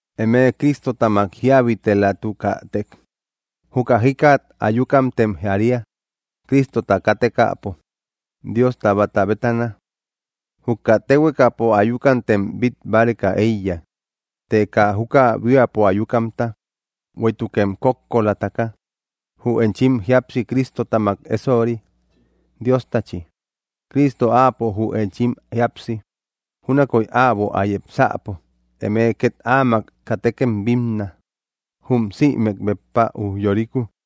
Eme Cristotamak jíabitelatukätek, juka jikat ayukamtem jaria, Cristota kátekäpo, Diosta báta bétana. Juka téhuekapo ayukamtem bít báreka éiya, të kaa juka buíapo ayukamta. Bueïtukem kókkolataka, jü enchim jíapsi Cristotamak ésori, Diostachi. Cristo áapo jü enchim jíapsi. Júnakoy äbo ä yepsäpo, eme két áamak katekem bínna, jum sïmek béppa ujyoriku.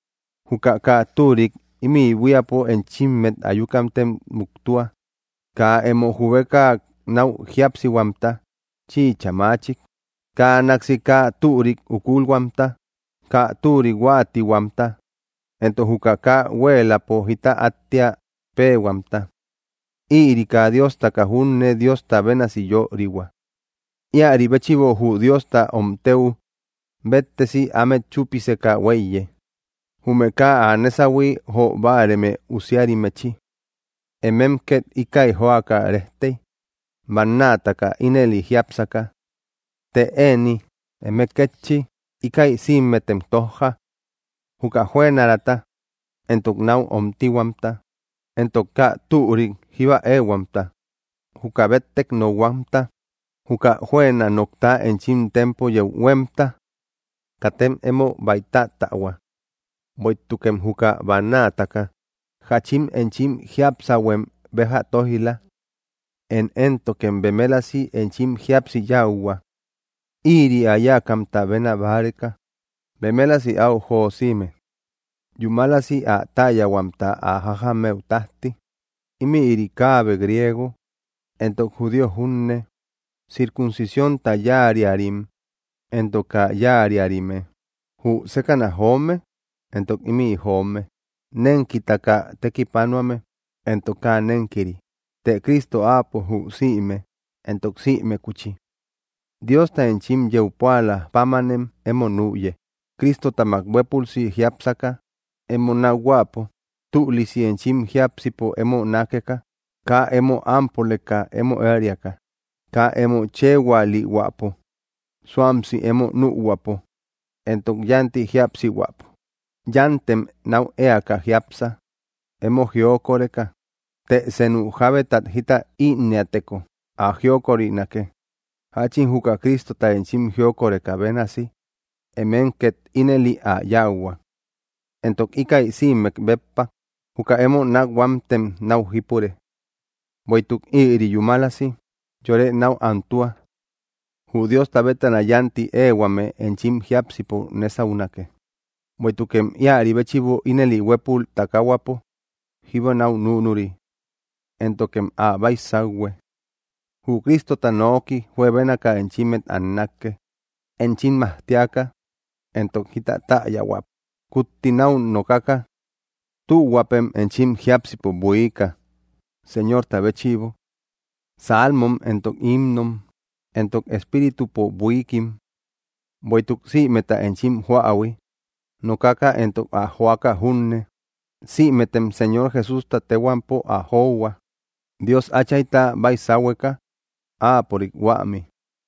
Juka kaa türik ímï buíapo enchimmet ayukamtem muktua: kaa emo jubeka náu jíapsihuamta, chïcha maachik, kaa náksi kaa türik ukulhuamta, kaa türik huáatihuamta, entok juka kaa huéeläpo jita áttia péehuamta; ïri kaa diostaka junne Diosta bénasi yörihua. Íäri béchïbo jü Diosta omtëu béttesi ámet chúpiseka huéiye, jume kaa ä nésahui jo báareme usiarimmechi. Emem ket íkäi joaka rejtey, bannaataka ínëli jiápsaka. Të ëni eme kétchi, íkäi sïmetem tójja: juka jüenaraata entok náu omtihuamta, entok kaa türik jíba éehuamta, juka béttek nokhuamta, juka juëna nokta enchim tempo yeu huémta. Katem emo baïtattähua; bueïtukem juka bannaataka jáchin enchim jiapsäuhuem béja tóij‑la. Én éntokem bemelasi enchim jíapsi yáuhua. Ïri ä yáakamta béna báreka, bemelasi áu josime, yúmalasi ä täyahuamta ä jajamëu tájti. Ímïri kaabe griego entok judío junne, circuncisiónta yáariarim entok kaa yáariarime, jü sékäna joome entok ímï joome, nénkitaka tekipanuame entok kaa nénkiri; të Cristo áapo jü sïme, entok sïmekuchi. Diosta enchim yeu púalä pámanem emo nüye, Cristotamak huépülsi jiápsaka emo nákhuäpo, tülisi enchim jiápsipo emo nákeka, kaa emo ámpoleka emo ériaka, kaa emo chëhualihuäpo, suamsi emo nühuäpo entok yánti jíapsihuäpo. Yántem náu éaka jiápsa, emo jiokoreka; të senu jábetat jita ínnëateko, ä jiokorinake. Jáchin juka Cristota enchim jiokorekä bénasi, emem két ínëli ä yáuhua. Entok íkäi sïmek béppa, juka emo nákhuamtem náu jípure; bueïtuk ïri yúmalasi yore náu antua. Jü Diosta bétana yánti éehuame enchim jiápsipo nésaunake, bueïtukem íäri béchïbo ínëli huépul takahuapo jíba náu núnuri. Éntokem ä baisauhue. Jü Cristota nooki juebénaka enchimmet annake, enchim majtiaka, entok jita täyahuäpo kutti náu nokaka. Tühuäpem enchim jiápsipo buiika, Señorta béchïbo: salmom, entok himnom, entok espíritupo buiikim. Bueïtuk sïmeta enchim joähui, nokaka entok ä joaka junne, sïmetem Señor Jesústa téhuampo ä johua, Dios Áchayta baisahueka, Áapörik huämi.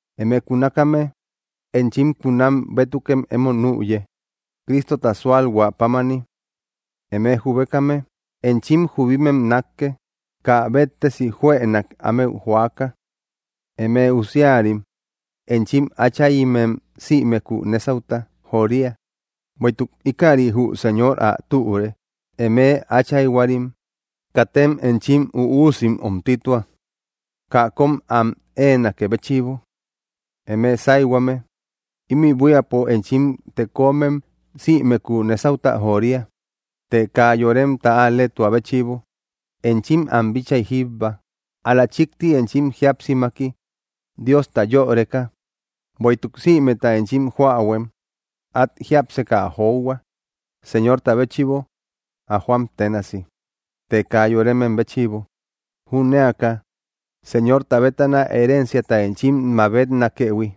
Eme kunakame, enchim kunam bétukem emo nüye, Cristota súalhuä pámani. Eme jubekame, enchim jubimem nákke, kaa béttesi juënak ámeu joaka. Eme usiarim, enchim áchayimem sïmeku nésauta joria, bueïtuk íkäri jü Señor ä türe. Eme áchayhuarim, katem enchim üusim omtitua, kaa kom am éenakë béchïbo. Eme sáyhuame, ímï buíapo enchim tekomem sïmeku nésauta joria, të kaa yoremta al‑leetua béchïbo enchim am bitchay jíbba, ál‑la chíkti enchim jíapsimaki, Diosta yöreka. Bueïtuk sïmeta enchim joähuem, át jiápseka ä johua, Señorta béchïbo ä joam ténasi, të kaa yoremem béchïbo, jünéaka Señorta bétana herenciata enchim mabetnakëhui;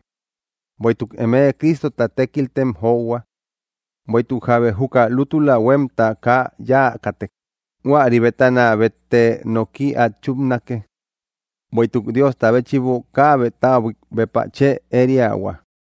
bueïtuk eme Cristota tékiltem johua. Bueïtuk jábe juka lútula huémta kaa yáakätek, huäri bétana bétte noki át chúpnake; bueïtuk Diosta béchïbo kaabe täbuik béppa chë ériahua.